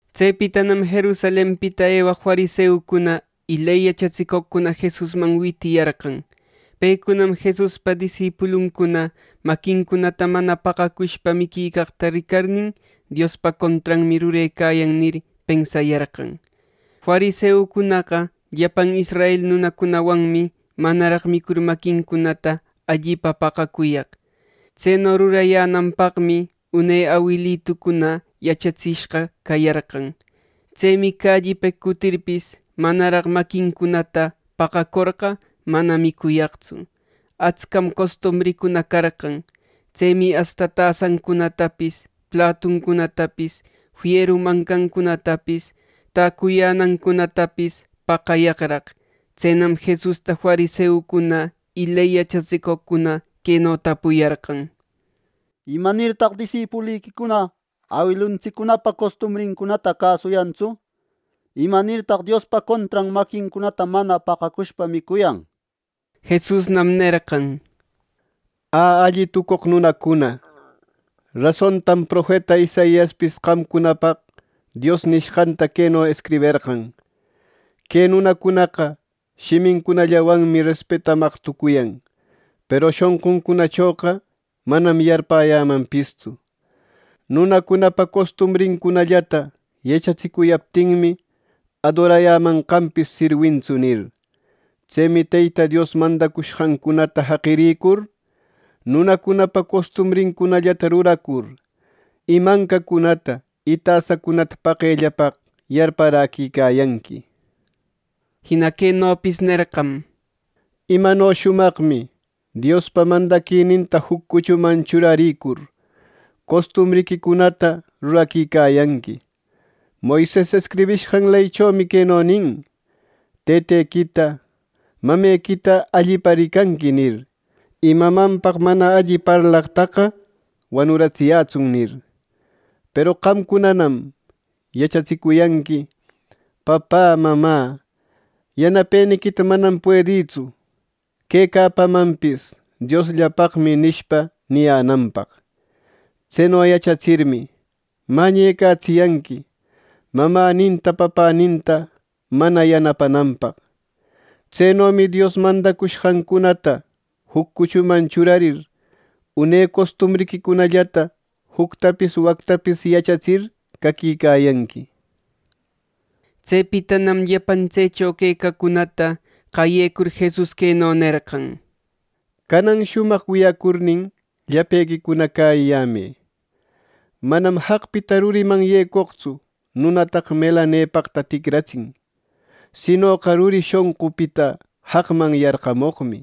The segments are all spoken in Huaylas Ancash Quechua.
Tsepitanam Jerusalenpita ewaq fariseucuna y ley yachatsicoqcuna Jesusman witiyarqan. Pecunam Jesuspa disipuluncuna maquincunata mana paqacushpa miquicaqta ricarnin, “Diospa contranmi rurecuyan” nir, pensayarqan. Fariseucunaqa llapan israel nunacunawanmi manaraq micur maquincunata allipa paqacuyaq. Tseno rurayänanpaqmi une awilitucuna yachatsishqa cayarqan. Tsemi callipeq cutirpis, manaraq maquincunata paqacorqa mana micuyaqtsu. Atscam costumbrincuna carqan. Tsemi asta tasancunatapis, platuncunatapis, fieru mancancunatapis, täcuyänancunatapis paqayaqraq. Tsenam Jesusta fariseucuna y ley yachatsicoqcuna queno tapuyarqan: —¿Imanirtaq disipuliquicuna awiluntsiccunapa costumbrincunata cäsuyantsu! ¿Imanirtaq Diospa contran maquincunata mana paqacushpa micuyan! Jesusnam nerqan: —¡Ä, alli tucoq nunacuna! Rasontam profeta Isaiaspis qamcunapaq Dios nishqanta queno escriberqan: ‘Que nunacunaqa shimincunallawanmi respetamaq tucuyan; Peru shonquncunachoqa manam yarpäyämanpistsu. Nunacunapa costumbrincunallata yachatsicuyaptinmi, adorayämanqanpis sirwintsu’, nir. Tsemi Teyta Dios mandacushqancunata jaqirïcur, nunacunapa costumbrincunallata ruracur y ˻mancacunata y tasacunata paqellapaq yarparäquicayanqui.˼ Jina quenopis nerqam: —Imano shumaqmi Diospa mandaquininta juc cuchuman churaricur, costumbriquicunata ruraquicayanqui. Moises escribishqan leychomi queno nin: ‘Tëtequita, mamequita allipa ricanqui’ nir. ‘Y mamanpaq mana alli parlaqtaqa wanuratsiyätsun’, nir. “Peru qamcunanam yachatsicuyanqui, ‘Papä, mamä, yanapeniquita manam puedïtsu. Quecapamanpis Diosllapaqmi’ nishpa, niyänanpaq. Tseno yachatsirmi, mañecatsiyanqui, mamäninta papäninta mana yanapayänanpaq. Tsenomi Dios mandacushqancunata juc cuchuman churarir, une costumbriquicunallata juctapis wactapis yachatsir caquicayanqui.” Tsepitanam llapan tsecho quecaqcunata qayecur Jesus queno nerqan: —¡Canan shumaq wiyacurnin, llapequicuna cäyiyämë! Manam jaqpita ruriman yecoqtsu nunataqa melanepaqta ticratsin, sinoqa ruri shonqupita jaqman yarqamoqmi.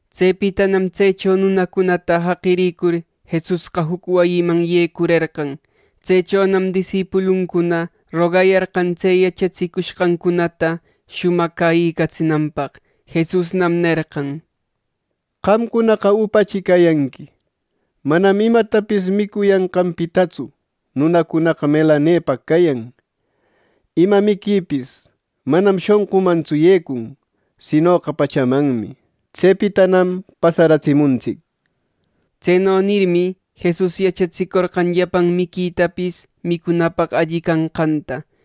Tsepitanam tsecho nunacunata jaqirïcur, Jesusqa juc wayiman yecurerqan. Tsechonam disipuluncuna rogayarqan tse yachatsicushqancunata shumaq cäyïcatsinanpaq. Jesusnam nerqan: —¿Qamcunaqa upachi cayanqui! Manam imatapis micuyanqanpitatsu nunacunaqa melanepaq cayan. Ima miquipis manam shonqumantsu yecun, sinoqa pachamanmi. Tsepitanam pasaratsimuntsic. (Tseno nirmi, Jesus yachatsicorqan llapan miquitapis micunapaq alli canqanta.)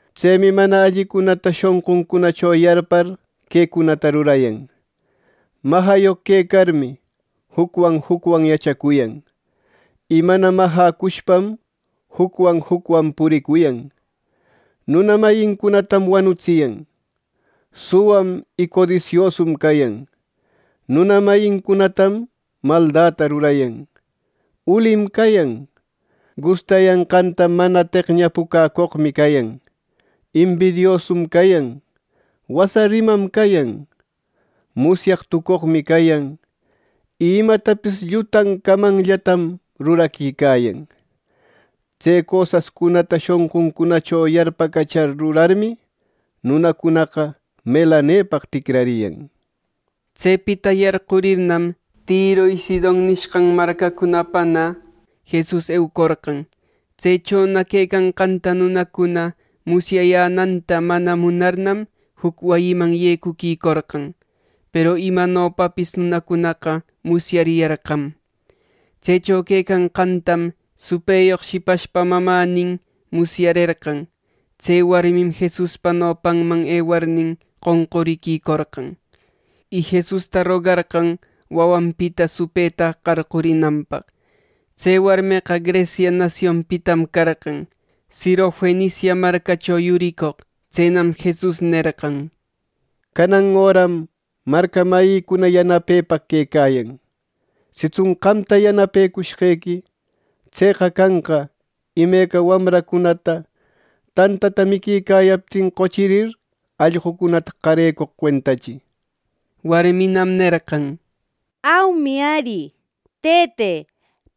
Tsemi mana allicunata shonquncunacho yarpar quecunata rurayan: majayoq quecarmi jucwan jucwan yachacuyan; y mana majäcushpam jucwan jucwan puricuyan. Nuna mayincunatam wanutsiyan; suwam y codisiosum cayan, nuna mayincunatam maldata rurayan, ulim cayan, gustayanqanta mana teqñapucäcoqmi cayan, embidiosum cayan, wasa rimam cayan, musyaq tucoqmi cayan y imatapis llutan camanllatam ruraquicayan. Tse cosascunata shonquncunacho yarpacachar rurarmi, nunacunaqa melanepaq ticrariyan. Tsepita yarqurirnam, Tiro ˻y Sidon˼ nishqan marcacunapana Jesus eucorqan. Tsechona quecanqanta nunacuna musyayänanta mana munarnam, juc wayiman yecuquicorqan. Peru imanopapis nunacunaqa musyariyarqam. Tsecho quecanqantam supëyoq shipashpa mamänin musyarerqan. Tse warmim Jesuspa nopanman ewarnin, qonquriquicorqan. Y Jesusta rogacorqan wawanpita supëta qarqurinanpaq. Tse warmeqa Grecia nasionpitam carqan, Sirofenicia marcacho yuricoq. Tsenam Jesus nerqan: —Canan öram marca mayïcuna yanapepaq quecayan. Sitsun qamta yanapecushqequi, tseqa canqa imeca wamracunata tantata miquicayaptin qochirir, allqucunata qarecoq cuentachi. Warminam nerqan: —Aumi ari, Tëte.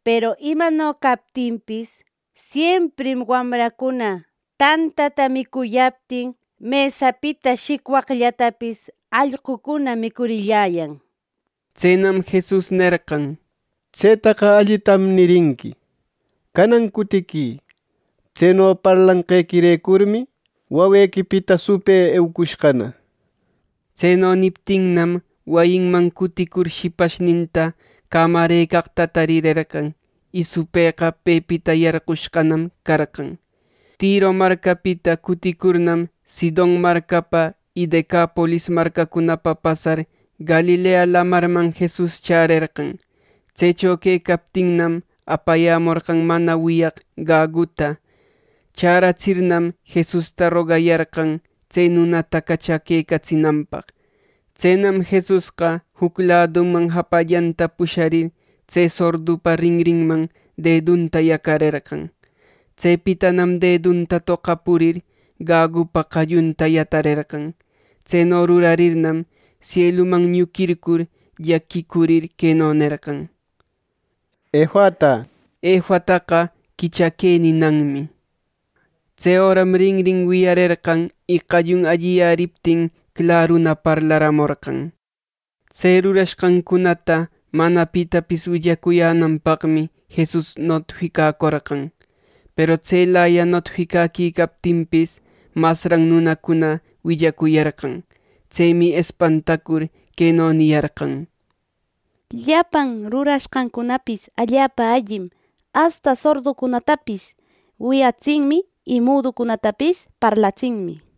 Peru imano captinpis, siemprim wamracuna tantata micuyaptin mesapita shicwaqllatapis allqucuna micurilläyan. Tsenam Jesus nerqan: —Tsetaqa allitam nirinqui. Canan cutiquï. Tseno parlanqequirecurmi, wawequipita supë eucushqana. Tseno niptinnam, wayinman cuticur shipashninta cämarëcaqta tarirerqan, y supëqa pepita yarqushqanam carqan. Tiro marcapita cuticurnam, Sidon marcapa y Decapolis marcacunapa pasar Galilea Lamarman Jesus chärerqan. Tsecho quecaptinmi, apayämorqan mana wiyaq gaguta. Chäratsirnam, Jesusta rogayarqan tse nunata cachaquecatsinanpaq. Tsenam Jesusqa, juc laduman japallanta pusharir, tse sordupa rinrinman dedunta yacarerqan. Tsepitanam dedunta toqapurir, gagupa qallunta yatarerqan. Tseno rurarirnam, sieluman ñuquircur llaquicurir, queno nerqan: —¡Efata! —nishpa. (Efataqa “Quichaquë” ninanmi.) Tse öram rinrin wiyarerqan, y qallun alliyäriptin claruna parlaramorqan. Tse rurashqancunata mana pitapis willacuyänanpaqmi Jesus notificacorqan. Peru tselaya notificaquicaptinpis, masran nunacuna willacuyarqan. Tsemi espantacur, queno niyarqan: —¡Llapan rurashqancunapis allapa allim; asta sorducunatapis wiyatsinmi y muducunatapis parlatsinmi! —nir.